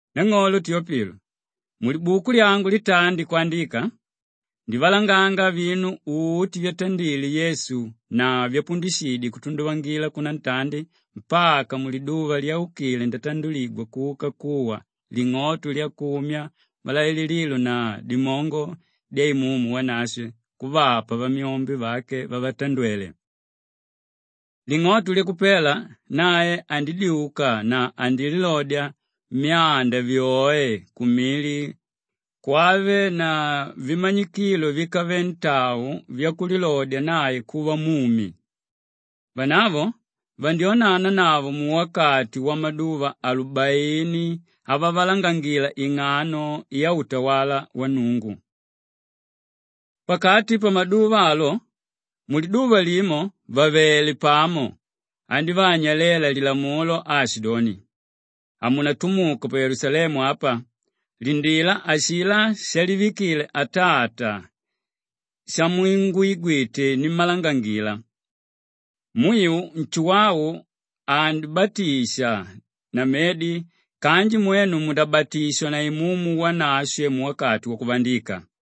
Nang'olo Teopilo! Mulibuku lyangu litandi kwandika, ndivalanganga vinu uti vyatandile Yesu na vyapundishidye kutunduvangila kunantandi mpaka muliduva lyaukile ndatanduligwa kuka kuwa ling'oto lyakumya malailililo na dimongo dya Imumu Wanashwe kuvapa vamyombe vake vavatandwele. Ling'oto lyakupela nae andidyuka na andililodya myanda vyoe kumili kwave na vimanyikilo víkave ntau vyakulilodya nae kuva mumi. Vanavo vandyonanavo muwakati wamaduva alubaini avavalangangila ing'ano yautawala wa Nnungu. Pakati pamaduva alo, muliduva limo vàvele pamo, andívaanyalela lilamulo aashidoni, “Hamunatumuke pa Yelusalemu apa; lindila ashilá shalivikile Atata shamungwigwite nimmalangangila. Mwiu Nshuwau andibatisha na medi kanji mwenu mundabatishwa na Imumu Wanashwe muwakati wakuvandika.”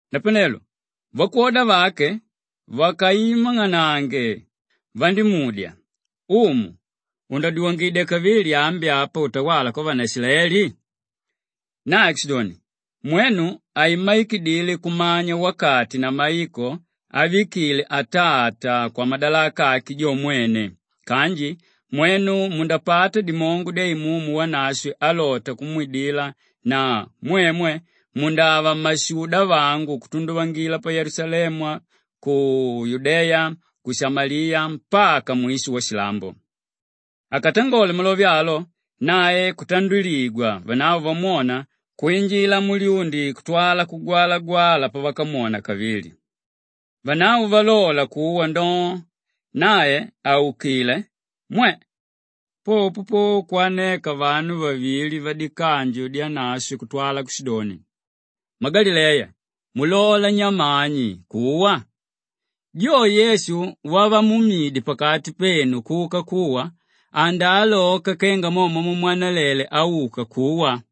Napanelo vakwoda vake vakaimang'anange vandímudya, “Umu, undadyuwangidya kavili ambi apa utawala kwavanaishilaeli?” Nae kushidoni, “Mwenu haimmaikidile kumanya wakati na maiko ávikile Atata kwamadalaka ake jo mwene kanji mwenu mundapata dimongo dya Imumu Wanashwe álota kumwidila na mwemwe mundava mmashuda vangu kutunduvangila pa Yelusalemu, ku Yudeya, ku Shamaliya mpaka mwisho washilambo.” Akatangole malove alo, nae kutanduligwa vanavo vamwona kwinjila mulyundi kutwala kugwalagwala pavakamwona kavili. Vanavo valola kuwa ndoo, nae àukile, mwe! Popo po kwaneka vanu vavili vadikanju dyanashwe kutwala kushidoni, “Mmagalileya, mulalela nyamani kuwa? Jo Yesu wavamuumidye pakati penu kuka kuwa, andaaloka kenga mo mwamumwanalele auka kuwa.”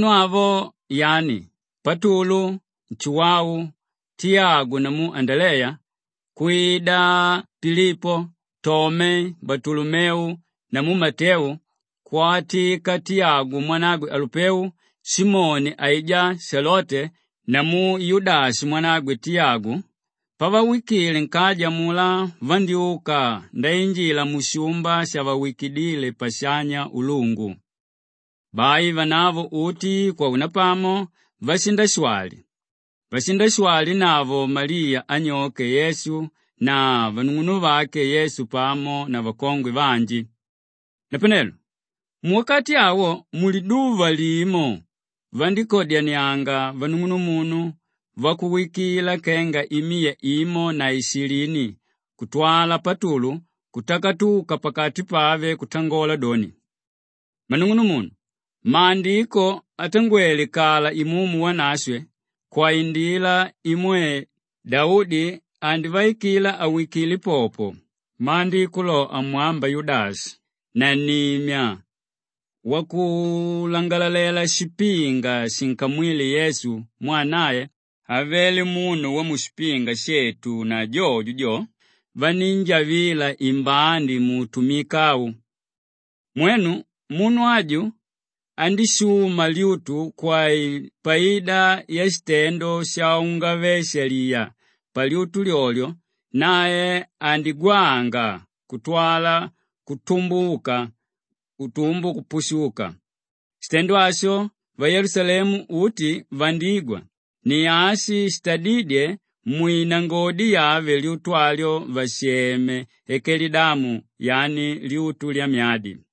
Vanu avo, yani Patulu, Nshuwau, Tiyagu namu Andaleya, kwida Pilipo, Tome, Balutolomeu namu Mateu, kwatika Tiyagu mwanagwe Alupeu, Simoni aijá Shelote namu Yudashi mwanagwe Tiyagu, pavawikile nkaja amulá vandyúka ndainjila mushumba shavawikidíle shapashanya ulungu. Bai vanavo uti kwaunapamo vashindashwali; vashindashwalinavo Maliya anyoke Yesu na vanung'unuvake Yesu pamo na vakongwe vanji. Napanelo muwakati awo muliduva limo vandíkadyanianga vanung'unumunu vakuwikila kenga imiya imo na ishilini kutwala Patulu kutakatuka pakati pave kutangola doni, “Mmanung'unumunu, Maandiko atangwele kala Imumu Wanashwe kwaindila imwe Daudi andivaikila awikile popo; Maandiko lo amwamba Yudashi, nannimya wakulangalalela shipinga shinkamwíle Yesu mwaa nae avele munu wamushipinga shetu na jojo jo, vanínjavila imbandi muutumika au.” Mwenu, munu aju andíshuma lyutu kwapaida yashitendo shaungave-shaliya; palyutu lyolyo lyo, nae andígwanga kutwala kutumbuka utumbu kupushuka. Shitendo asho vayelusalemu uti vandígwa; ni ashi shitadídye mwinangodi yave lyutu alyo vasheme Akelidama yani lyutu lyamyadi.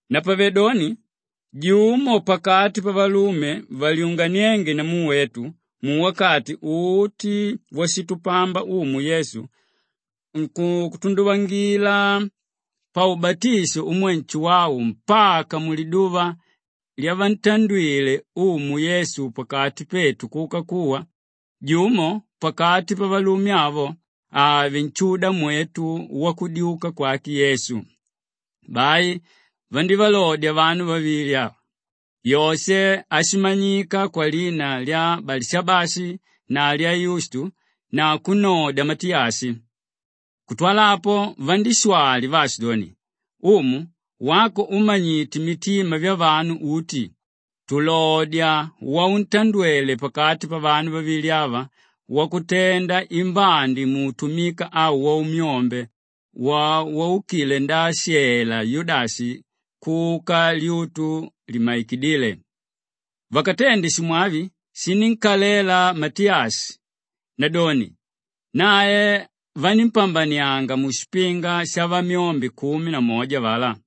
Napavedoni jumo pakati pavalume valyunganiénge namu wetu muwakati uti washitupamba Umu Yesu kutunduvangila paubatisho umwe Nshuwau mpaka muliduva lyavantandwile Umu Yesu pakati petu kuka kuwa, jumo pakati pavalume avo ave nshudamwetu wakudyuka kwake Yesu.” Bai vandívalodya vanu vavili: Yoshe áshimanyika kwalina lya Balishabashi na lya Yustu na kunnodya Matiyashi. Kutwala apo vandíshwali vaashidoni, “Umu, wako úmanyite mitima vyavanu uti tulodya wauntandwele pakati pavanu vavili ava wakutenda imbandi muutumika au waumyombe wo waukile ndaashela Yudashi kuka lyutu limmaikidíle.” Vakatende shimwavi shinínkalela Matiyashi; nadoni nae vanímpambanianga mushipinga shavamyombe kumi na moja avalá.